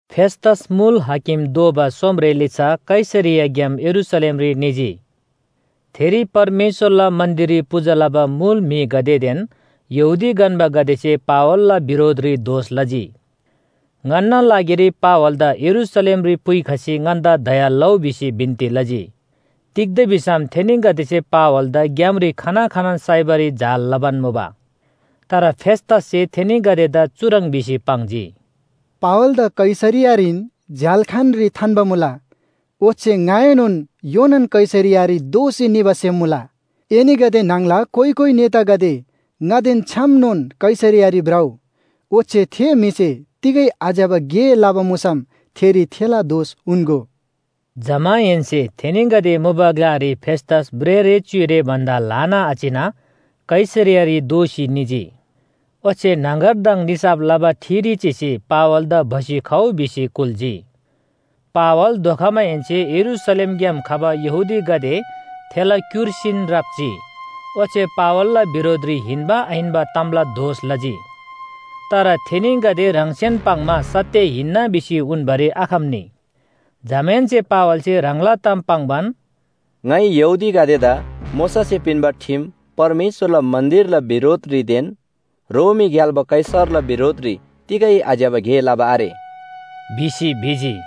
फेस्‍तस मुल हाकिम दोबा सोमरे लिच्‍छा कैसरियाग्‍याम यरूशलेमरी निजी। थेरी परमेश्‍वरला मन्‍दिररी पूजा लबा मुल म्‍हिगदेदेन यहूदी गन्‍बागदेसे पावलला बिरोधरी दोष लजी। ङन्‍ना लागिरी पावलदा यरूशलेमरी पुइखसी ङन्‍दा दया लउ भिसी बिन्‍ती लजी। तिग्‍दा भिसम थेनीगदेसे पावलदा ग्‍यामरी खना खनान साइबारी जाल लबान मुबा। तर फेस्‍तससे थेनीगदेदा चुह्रङ् भिसी पाङ्जी, “पावलदा कैसरियारीन झ्‍याल्‍खानरी थान्‍बा मुला, ओच्‍छे ङाएनोन योनान कैसरियारी दोःसी निबा सेम मुला। एनीगदे न्‍हङला कोइ कोइ नेतागदे ङादेन छ्‌यामनोन कैसरियारी भ्रउ, ओच्‍छे थे म्‍हिसे तिगै आज्‍यबा गे लबा मुसम थेरी थेला दोष उन्‍गो।” जमाहेन्‍से थेनीगदे मुबा ग्‍लारी फेस्‍तस भ्रेःरे च्‍युइरे भन्‍दा ल्‍हाना आचिना कैसरियारी दोःसी निजी। ओच्‍छे न्‍हङगरदङ निसाफ लबा ठिरी चिसी पावलदा भसी खउ भिसी कुल्‍जी। पावल धोखमाहेन्‍से यरूशलेमग्‍याम खबा यहूदीगदे थेला क्‍युर्सीन राप्‍जी। ओच्‍छे पावलला बिरोधरी हिन्‍बा आहिन्‍बा तामला दोष लजी। तर थेनीगदे ह्राङसेन पाङ्‌मा सत्‍य हिन्‍ना भिसी उन्‍बारी आखम्‍नी। जमाहेन्‍से पावलसे ह्राङला ताम पाङ्‌बान, “ङाइ यहूदीगदेदा मोशासे पिन्‍बा ठिम, परमेश्‍वरला मन्‍दिरला बिरोधरीदेन रोमी ग्‍याल्‍बो कैसरला बिरोधरी तिगै आज्‍यबा गे लबा आरे” भिसी भिजी।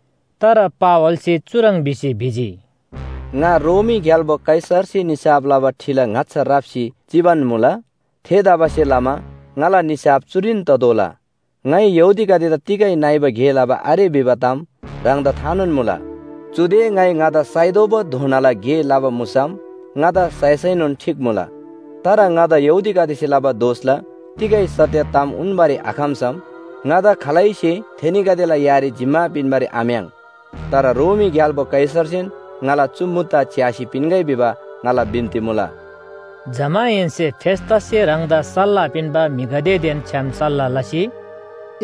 तर पावलसे चुह्रङ् भिसी भिजी, “ङा रोमी ग्‍याल्‍बो कैसरसे निसाफ लबा ठिला ङाच्‍छा राप्‍सी चिबान मुला। थेतबासेलमा ङाला निसाफ चुरीन ततोःला। ङाइ यहूदीगदेदा तिगै नइबा गे लबा आरे भिबा ताम ह्राङदा थानोन मुला। चुदे ङाइ ङादा साइतोःबाधोनाला गे लबा मुसम ङादा साइसैनोन ठीक मुला। तर ङादा यहूदीगदेसे लबा दोषला तिगै सत्‍य ताम उन्‍बारी आखम्‍सम ङादा खालैसे थेनीगदेला यारी जिम्‍मा पिन्‍बारी आम्‍याङ्। तर रोमी ग्‍याल्‍बो कैसरसेन ङाला चु मुद्दा च्‍यासी पिन्‍गै भिबा ङाला बिन्‍ती मुला।” जमाहेन्‍से फेस्‍तससे ह्राङदा सल्‍लाह पिन्‍बा म्‍हिगदेदेन छ्‌याम सल्‍लाह लसी,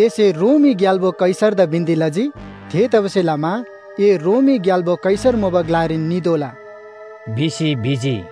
“एसे रोमी ग्‍याल्‍बो कैसरदा बिन्‍ती लजी। थेतबासेलमा ए रोमी ग्‍याल्‍बो कैसर मुबा ग्‍लारीन नितोःला” भिसी भिजी।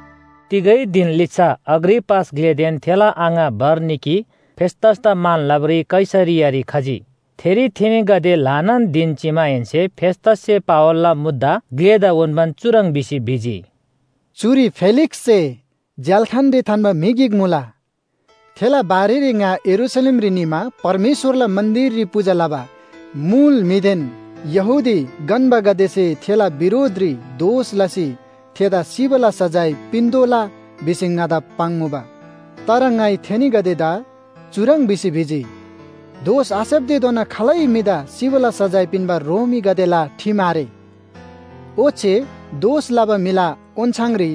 तिगै धिन लिच्‍छा अग्रिपास ग्‍लेदेन थेला आङा बरनिकी फेस्‍तसदा मान लबारी कैसरियारी खजी। थेरी थेनीगदे ल्‍हानान धिन चिमाहेन्‍से फेस्‍तससे पावलला मुद्दा ग्‍लेदा उन्‍बान चुह्रङ् भिसी भिजी, “चुरी फेलिक्‍ससे झ्‍याल्‍खानरी थान्‍बा म्‍हि गिक मुला। थेला बारेरी ङा यरूशलेमरी निमा परमेश्‍वरला मन्‍दिररी पूजा लबा मुल म्‍हिदेन यहूदी गन्‍बागदेसे थेला बिरोधरी दोष लसी थेदा सिबाला सजाय पिन्‍तोःला भिसी ङादा पाङ्मुबा। तर ङाइ थेनीगदेदा चुह्रङ् भिसी भिजी, ‘दोष आस्‍याप्‍तेधोना खालै म्‍हिदा सिबाला सजाय पिन्‍बा रोमीगदेला ठिम आरे। ओच्‍छे दोष लबा म्‍हिला ओन्‍छाङरी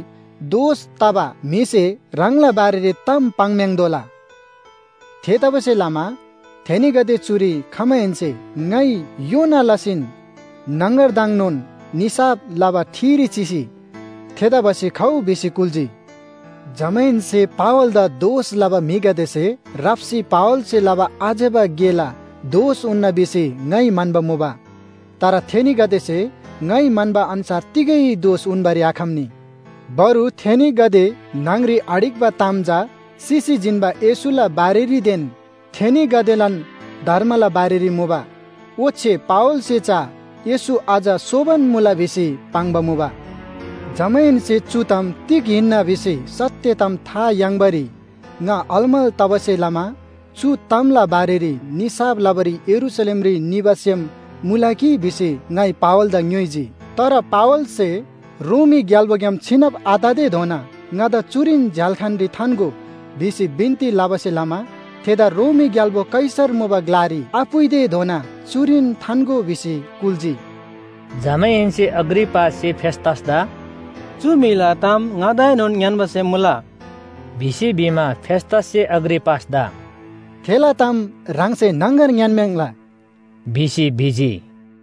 दोष तबा म्‍हिसे ह्राङला बारेरी ताम पाङ्‌म्‍याङ्‍तोःला।’ थेतबासेलमा थेनीगदे चुरी खमाहेन्‍से ङाइ योना लसीन न्‍हङगरदङनोन निसाफ लबा ठिरी चिसी थेदा भसी खउ भिसी कुल्‍जी। जमाहेन्‍से पावलदा दोष लबा म्‍हिगदेसे राप्‍सी पावलसे लबा आज्‍यबा गेला दोष उन्‍ना भिसी ङाइ म्‍हन्‍बा मुबा। तर थेनीगदेसे ङाइ म्‍हन्‍बा अन्‍छार तिगै दोष उन्‍बारी आखम्‍नी। बरु थेनीगदे न्‍हङरी आढिक्‍बा ताम चा सिसी जिन्‍बा येशूला बारेरीदेन थेनीगदेलान धर्मला बारेरी मुबा। ओच्‍छे पावलसे चा येशू अझ सोबान मुला भिसी पाङ्बा मुबा। जमाहेन्‍से चु ताम तिग हिन्‍ना भिसी सत्‍य ताम था याङ्बारी ङा अलमल तबासे लमा चु तामला बारेरी निसाफ लबारी यरूशलेमरी निबा सेम मुला कि भिसी ङाइ पावलदा ङ्‌योइजी। तर पावलसे रोमी ग्‍याल‍बोग्‍याम छिनब आततेधोना ङादा चुरीन झ्‍याल्‍खानरी थान्‍गो भिसी बिन्‍ती लबासे लमा थेदा रोमी ग्‍याल्‍बो कैसर मुबा ग्‍लारी आपुइतेधोना चुरीन थान्‍गो भिसी कुल्‍जी।” जमाहेन्‍से अग्रिपाससे फेस्‍तसदा “चु म्‍हिला ताम ङादाएनोन ङ्‌यान्‍बा सेम मुला” भिसी भिमा फेस्‍तससे अग्रिपासदा “थेला ताम ह्राङसे न्‍हङगर ङ्‌यान्‍म्‍याङ्‌ला” भिसी भिजी।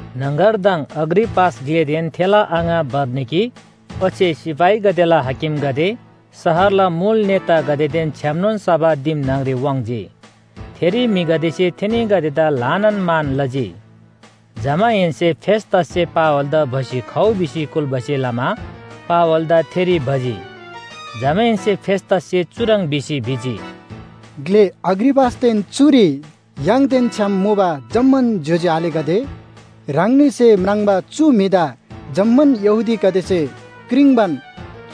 न्‍हङगरदङ अग्रिपास ग्‍लेदेन थेला आङा बरनिकी ओच्‍छे सिपाहीगदेला हाकिमगदे, शहरला मुल नेतागदेदेन छ्‌यामनोन सभा दिम न्‍हङरी वाङ्‌जी, थेरी म्‍हिगदेसे थेनीगदेदा ल्‍हानान मान लजी। जमाहेन्‍से फेस्‍तससे पावलदा भसी खउ भिसी कुल्‍बासे लमा पावलदा थेरी भजी। जमाहेन्‍से फेस्‍तससे चुह्रङ् भिसी भिजी, “ग्‍ले अग्रिपासदेन चुरी य्‍हाङदेन छ्‌याम मुबा जम्‍मान ज्‍योज्‍यो आलेगदे, ह्राङनीसे म्राङ्बा चु म्‍हिदा जम्‍मान यहूदीगदेसे क्रिङ्‌बान,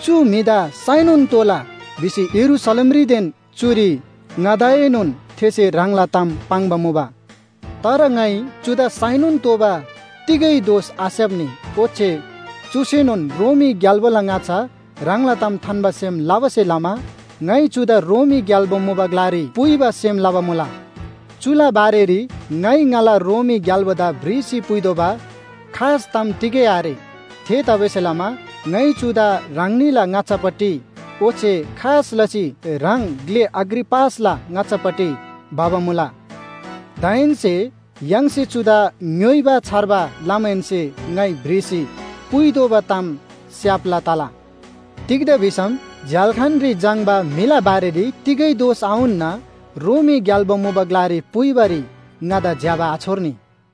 ‘चु म्‍हिदा साइनोन तोःला’ भिसी यरूशलेमरीदेन चुरी ङादाएनोन थेसे ह्राङला ताम पाङ्बा मुबा। तर ङाइ चुदा साइनोन तोःबा तिगै दोष आस्‍याप्‍नी ओच्‍छे चुसेनोन रोमी ग्‍याल्‍बोला ङाच्‍छा ह्राङला ताम थान्‍बा सेम लबासे लमा ङाइ चुदा रोमी ग्‍याल्‍बो मुबा ग्‍लारी पुइबा सेम लबा मुला। चुला बारेरी ङाइ ङाला रोमी ग्‍याल्‍बोदा भ्रिसी पुइतोःबा खास ताम तिगै आरे। थेतबासेलमा ङाइ चुदा ह्राङनीला ङाच्‍छापट्टि ओच्‍छे खास लसी ह्राङ ग्‍ले अग्रिपासला ङाच्‍छापट्टि भबा मुला, दाहेन्‍से य्‍हाङसे चुदा ङ्‌योइबा छार्बा लमाहेन्‍से ङाइ भ्रिसी पुइतोःबा ताम स्‍याप्‍ला तला। तिग्‍दा भिसम झ्‍याल्‍खानरी झाङ्‌बा म्‍हिला बारेरी तिगै दोष आउन्‍ना रोमी ग्‍याल्‍बो मुबा ग्‍लारी पुइबारी ङादा ज्‍यबा आछोर्नी।”